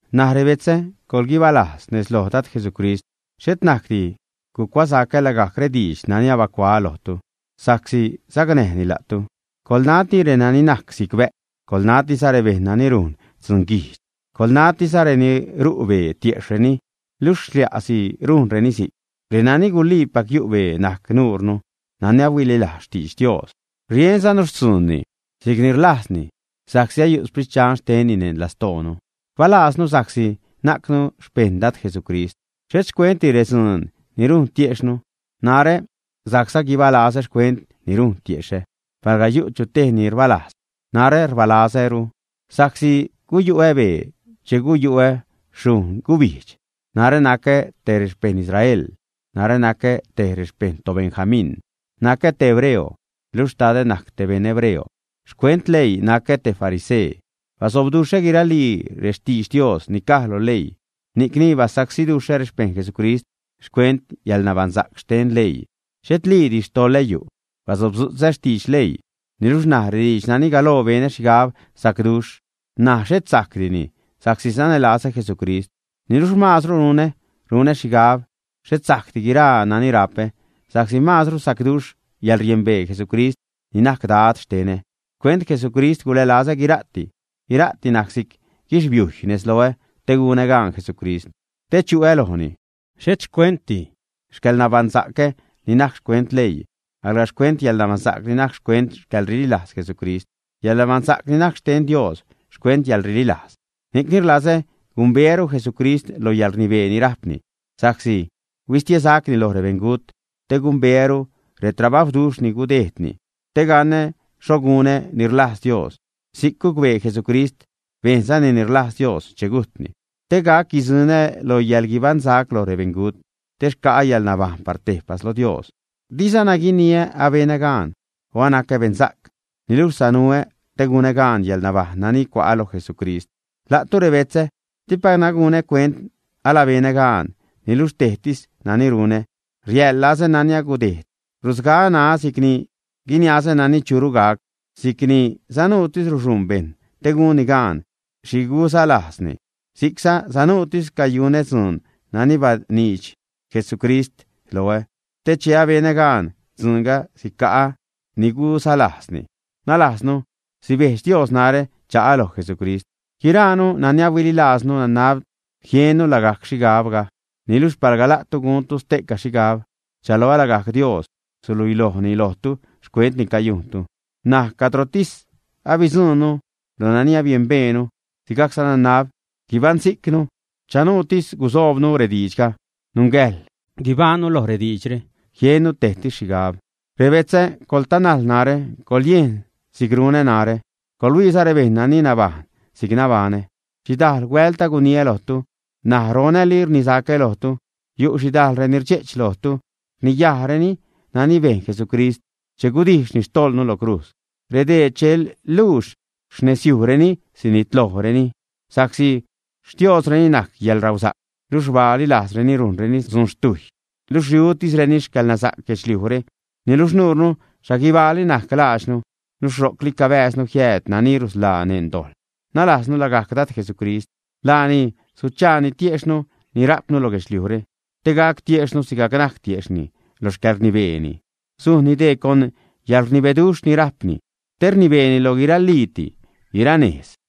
N̲aj rebetzä, coḻguibalajz nez lo Dad Jesucrist. Xhet najcdi gucuasacä lagajc rediidx nani abacuaä lojtu, sa'csi sacnäjni la'tu. Coḻnati renani najc si'c bä'cw. Coḻnatiza rebejṉ nani rujn dzun guijdx. Coḻnatiza reni ru' bee tiejxhtisreni luxh xlia'si rujnreni si'c. Renani guliipac yu' bee najc nuure nani ahuililajz xtidx Dios, rienzanu xtzuunni si'cni rlajzni sa'csi ayu' Sprit Dxan xtenni neṉ lastoonu. Rbalaaznu sa'csi najcnu xpejṉ Dad Jesucrist, xhet xcuentdi redzuun ni rujn tiejxhnu. Narä sajcza guibalazä xcuent ni rujn tiexhä. Palga yu' chu tej ni rbalajz, narä rbalazäru sa'csi guyu'ä bee che guyu'ä xhujṉ gubijdx; narä nacä te rexpejṉ Israel; narä nacä tej rexpejṉ toBenjamín, nacä te hebreo, luxh xtadä najc te beṉ hebreo; xcuent leii nacä te farisee. Basobduxhä guiralii rextidx Dios ni caj lo leii ni'cni basacsiduxhä rexpeṉ Jesucrist; xcuent yäḻnabaṉsa'c xten leii, xhetliidi xtoḻä yu'; basobdzu'tzä xtidx leii. Niluxh ṉaj rediidx nani galoo benä xhigab sacduxh, ṉaj xhet sajcdini sa'csi sanälazä Jesucrist. Niluxh maazru runä: runä xhigab xhet sajcdi guiraa nani rapä, sa'csi maazru sacduxh yäḻriembee Jesucrist ni najc Dad xtenä. Xcuent Jesucrist gulälazä guira'ti, guira'ti najc si'c guixbiujy nez loä te gunä gaan Jesucrist, te chu'ä lojni, xhet xcuentdi xcäḻnabaṉsa'cä ni najc xcuent leii, alga xcuent yäḻnabaṉsa'c ni najc xcuent xcäḻrililajz Jesucrist, yäḻnabaṉsa'c ni najc xten Dios xcuent yäḻrililajz. Ni'cni rlazä gumbeäru Jesucrist loj yäḻrnibee ni rajpni sa'csi huistie gubaṉsa'cni sacni loj rebeṉgut, te gumbeäru retrabajwduxh ni gudejdni, te ganä xho gunä ni rlajz Dios si'c gucbee Jesucrist, bejnzani ni rlajz Dios che gujtni. Te gac guidzuṉä lo yäḻguibaṉsac loj rebeṉgut te xca'ä yäḻnabajṉ par tejpas lo Dios. Dizana guiniä “abenä gaan” o “anacä beṉsa'c”, alga sanuätis te gunä gaan yäḻnabajṉ nani cua'ä lo Jesucrist. La'tu rebetzä, dipacna gunä cuent alabenä gaan, niluxh tejtis nani runä, riaḻlazä nani agudejd, rusgaä ṉaä si'cni guiniazä nani churu gac. Si'cni sanuutis ruxuṉ bejṉ te gunni gaan xhi guzalajzni, si'cza sanuutis cayunä dzuun nani baniidx Jesucrist loä, te che abenä gaan dzuunga sica'ä ni guzalajzni, nalajznu sibejdx Dios narä cha'a loj Jesucrist. Guiraanu nani ahuililajznu, nanab jiennu lagajc xhigabga, niluxh palga la'tu guntu ste'ca xhigab, rchaloä lagajc Dios suluilojni lojtu xcuent ni et laadi cayujntu. N̲aj, cadrotis abidzuṉnu lo nani abiembeenu, sigajcza nanab guibaṉsijcnu, chanuutis gusoobnu rediidxga; nungäjḻ guibajṉnu loj rediidxre, jiennu tejsi xhigab. Rebetzä, coḻtanajl narä, coḻyejn si'c runä narä, coḻhuiiza rebejṉ nani nabajṉ si'c nabaṉä. Xhidajl huält aguniä lojtu, ṉaj ronäli rnisacä lojtu, yu' xhidajl reni rdxe'ch lojtu, rniyajreni nani bejn Jesucrist che gudijxni xtojḻnu lo crujz. Redee che luux xnezyujreni sinitlojreni, sa'csi xtioozreni najc yäḻrausa'c; luxh rbaali lajzreni rujnreni dzun xtujy; luxh riutisreni xcäḻnasa'c guedxliujre. Niluxh nuure, xhaguibaali najc laadxnu, luxh ro'cli cabääznu jiääd nani rusḻaanu neṉ dojḻ, nalaaznu lagajc Dad Jesucrist. Laani suchaani tiexhnu ni rajpnu lo guedxliujre, te gac tiexhnu sigajc najc tiejxhni lo xcäḻrnibeeni. Sujnni dee con yäḻrnibeduxh ni rajpni te rnibeeni loj guirali'ti, guiraa nejz.